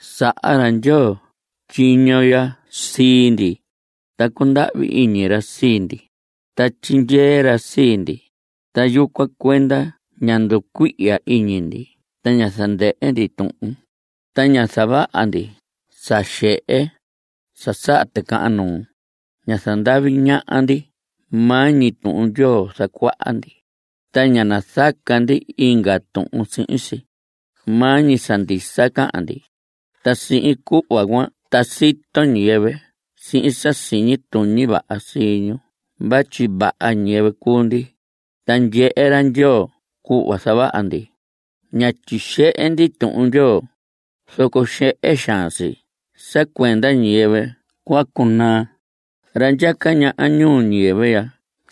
Saha ra Ndyoo tyiño ya sii ndi, ta cundahvi iñi ra sii ndi, ta tyindyee ra sii ndi. Ta yucuan cuenda ña nducuihya iñi ndi ta ña zandɨhɨ ndi tuhun. Ta ña zavaha ndi sa xehe, sa saha ticahan nuu. Ña zandavi ñaha ndi. Maa ñi Tuhun Ndyoo zacuaha ndi, ta ña nazaca ndi inga tuhun sihin si. Maa ñi sa ndisa cahan ndi. Ta sihin cuhva cuan ta sito ñiyɨvɨ sihin sa siñi tuñi vaha ñu vatyi vaha ñiyɨvɨ cuu ndi, ta ndyehe ra Ndyoo cuhva zavaha ndi. Ña tyixehe ndi Tuhun Ndyoo. Zoco xehe xaan si sa cuenda ñiyɨvɨ cua cunaa. Ra ndyaca ñaha ñuu ñiyɨvɨ ya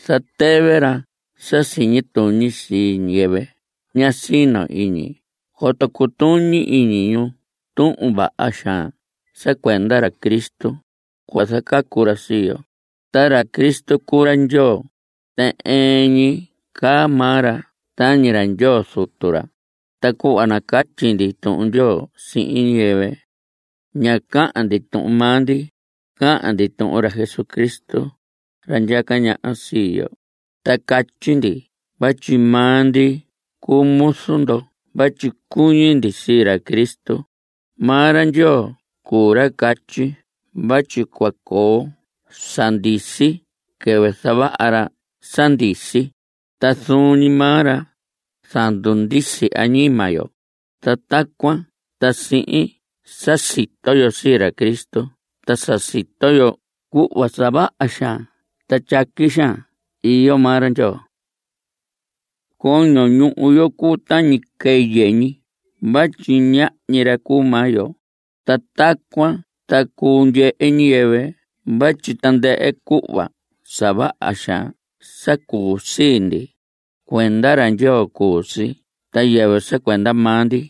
zatɨvɨ ra sa siñi tuñi sii ñiyɨvɨ ña sino iñi coto cutuñi iñi ñu tuhun vaha xaan sa cuenda ra Cristo, cuhva zacacu ra sii yo. Ta ra Cristo cuu ra Ndyoo, ta ɨɨn ñi caa maa ra tañi ra Ndyoo Zutu ra. Ta cuhva nacatyi ndi Tuhun Ndyoo sihin ñiyɨvɨ, ña cahan ndi tuhun maa ndi, cahan ndi tuhun ra Jesucristo, ra ndyaca ñaha sii yo. Ta catyi ndi vatyi maa ndi cuu muzu ndo vatyi cuñi ndi sii ra Cristo. Maa ra Ndyoo cuu ra catyi vatyi cua coo sa ndisi quɨvɨ zavaha ra sa ndisi, ta zuun ñi maa ra zandundisi añima yo. Ta tacuan ta sihin sa sito yo sii ra Cristo ta sa sito yo cuhva sa vaha xaan ta tyaqui xaan iyo maa ra Ndyoo. Coño ñuhu yo cuu tañi quɨyɨ ñi vatyi ñahñi ra cuu maa yo. Ta tacuan ta cuu ndyehe ñiyɨvɨ vatyi tandɨhɨ cuhva sa vaha xaan sa cuu sii ndi, cuenda ra Ndyoo cuu si ta yɨvɨ sa cuenda maa ndi.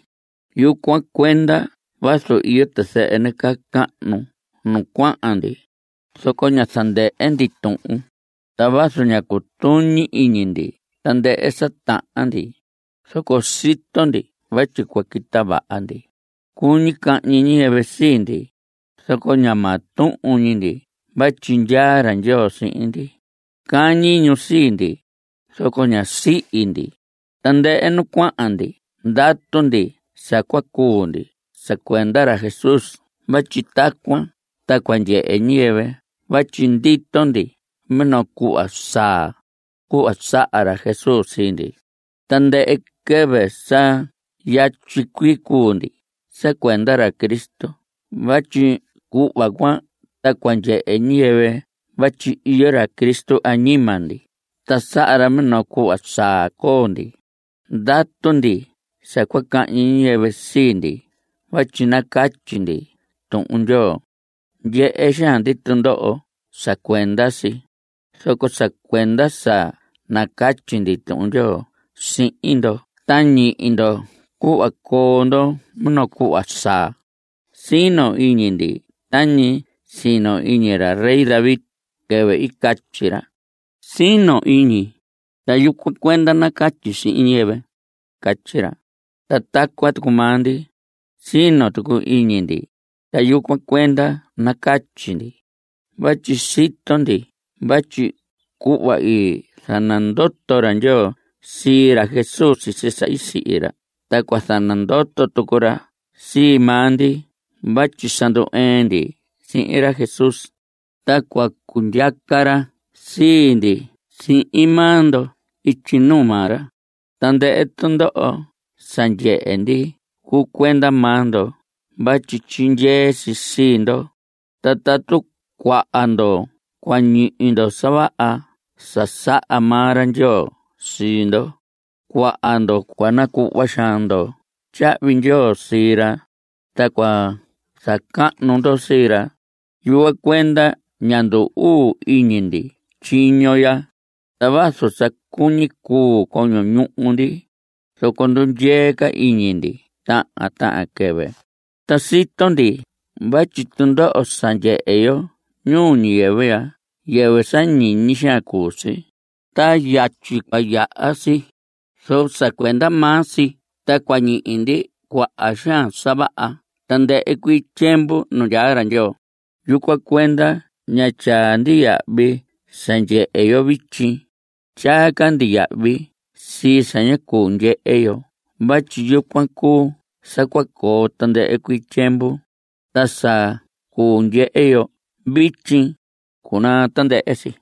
Yucuan cuenda vazu iyo tizɨhɨ nacahnu nu cuahan ndi, zoco ña zandɨhɨ ndi tuhun. Ta vazu ña cutuñi iñi ndi tandɨhɨ sa tahan ndi, zoco sito ndi vatyi cua quita vaha ndi. Cuñi cahñi ñiyɨvɨ sii ndi, zoco ña maa tuhun ñi ndi vatyi ndyaa ra Ndyoo sihin ndi. Cañi ñu sii ndi, zoco ñá sihi ndi. Tandɨhɨ nu cuahan ndi ndatu ndi sa cua cuu ndi sa cuenda ra Jesús vatyi tacuan ta cua ndyehe ñiyɨvɨ vatyi ndito ndi minoo cuhva saa, cuhva saha ra Jesús sii ndi. Tandɨhɨ quɨvɨ sa yatyi cuii cuu ndi sa cuenda ra Cristo vatyi cuhva cuan ta cua ndyehe ñiyɨvɨ vatyi iyo ra Cristo añima ndi ta saha ra minoo cuhva saa coo ndi. Ndatu ndi sa cua cahñi ñiyɨvɨ sii ndi vatyi nacatyi ndi Tuhun Ndyoo. Ndyehe xaan ndi tundoho sa cuenda si, zoco sa cuenda sa nacatyi ndi Tuhun Ndyoo sihin ndo ta ñihi ndo cuhva coo ndo minoo cuhva saa. Sino iñi ndi tañi i sino iñi ra rey David quɨvɨ i catyi ra: “Sino iñi, ta yucuan cuenda nacatyi sihin ñiyɨvɨ.” Catyi ra. Ta tacuan tucu maa ndi, sino tucu iñi ndi, ta yucuan cuenda nacatyi ndi. Vatyi sito ndi vatyi cuhva i zanandoto ra Ndyoo sii ra Jesús sisi sa i sihi ra ta cua zanandoto tucu ra sii maa ndi vatyi sa ndu‑ɨɨn ndi sihin ra Jesús, ta cua cundyaca ra sii ndi sihin maa ndo ityi nuu maa ra. Tandɨhɨ tundoho sa ndyehe ndi cuu cuenda maa ndo vatyi tyindyee si sii ndo. Ta tatu cuaha ndo cua ñihi ndo sa vaha sa saha maa ra Ndyoo sii ndo, cuaha ndo cua nacuhva xaan ndo tyahvi ndyoo sii ra, ta cua zacahnu ndo sii ra. Yucuan cuenda ña ndu‑uu iñi ndi tyiño ya. Ta vazu sa cuñi cuu coño ñuhu ndi, zoco ndundyee ca iñi ndi tahan tahan quɨvɨ. Ta sito ndi vatyi tundoho sa ndyehe yo ñuu ñiyɨvɨ ya yɨvɨ sa ñiñi xaan cuu si, ta yatyi cua yaha si. Zoco sa cuenda maa si ta cua ñihi ndi cuaha xaan sa vaha tandɨhɨ cuii tyiemvu nu ndyaa ra Ndyoo. Yucuan cuenda ña tyaa ndi yahvi sa ndyehe yo vityi. Tyaa ca ndi yahvi sii sa ña cuu ndyehe yo vatyi yucuan cuu sa cua coo tandɨhɨ cuii tyiemvu. Ta sa cuu ndyehe yo vityi, cunaa tandɨhɨ si.